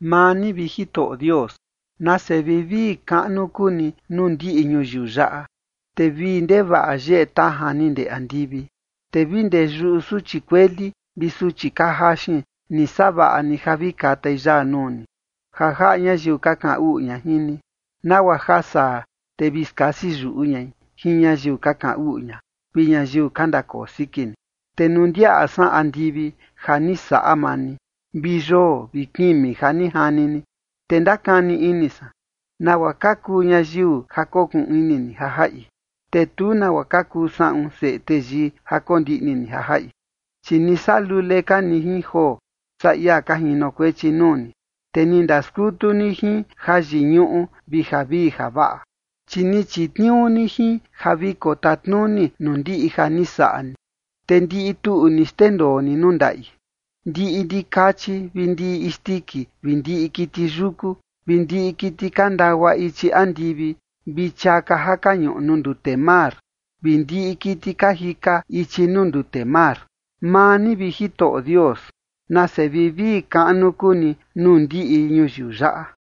Maa ni, vi Jitoꞌo Dios, nase vivii kaꞌnu kuu ni nuu ndiꞌi ñuyiu yaꞌa, te vii ndevaꞌa yeꞌe tajan ni ndee andivi. Te vi ndee yuꞌu suchi kueli vi suchi ka jaxin ni savaꞌa ni ja vi katai yaa nuu ni, ja jaꞌa ñayiu ka kaꞌan uꞌu ña jin ni, nagua ja saa, te vi skasi yuꞌu ñai jin ñayiu ka kaꞌan uꞌu ña vi ñayiu ka ndakoo siki ni. Te nuu ndiaꞌa san andivi ja ni saꞌa maa ni, vi yoo vi kimi ja ni jani ni, te ndakani ini san: “¿Nagua ka kuu ñayiu ja kokuꞌun ini ni ja jaꞌi?” Te tu nagua ka kuu saꞌun seꞌe teyii ja kondiꞌni ni ja jaꞌi. Chi ni saꞌa lule ka ni jin joo saa ia ka jinokuechi nuu ni, te ni ndaskutu ni jin jayiñuꞌu vi javii javaꞌa. Chi ni chitniuu ni jin ja vi kotatnuni nuu ndiꞌi ja ni saꞌa ni, te ndiꞌi tuꞌu ni xndendoo ni nuu ndaꞌi: Ndiꞌi ndikachi vi ndiꞌi isndiki vi ndiꞌi kiti yuku, vi ndiꞌi kiti ka ndagua ichi andivi, vi chiaka ja ka ñuꞌu nuu ndute mar, vi ndiꞌi kiti ka jika ichi nuu ndute mar. Maa ni, vi Jitoꞌo Dios, nase vivii kaꞌnu kuu ni nuu ndiꞌi ñuyiu yaꞌa.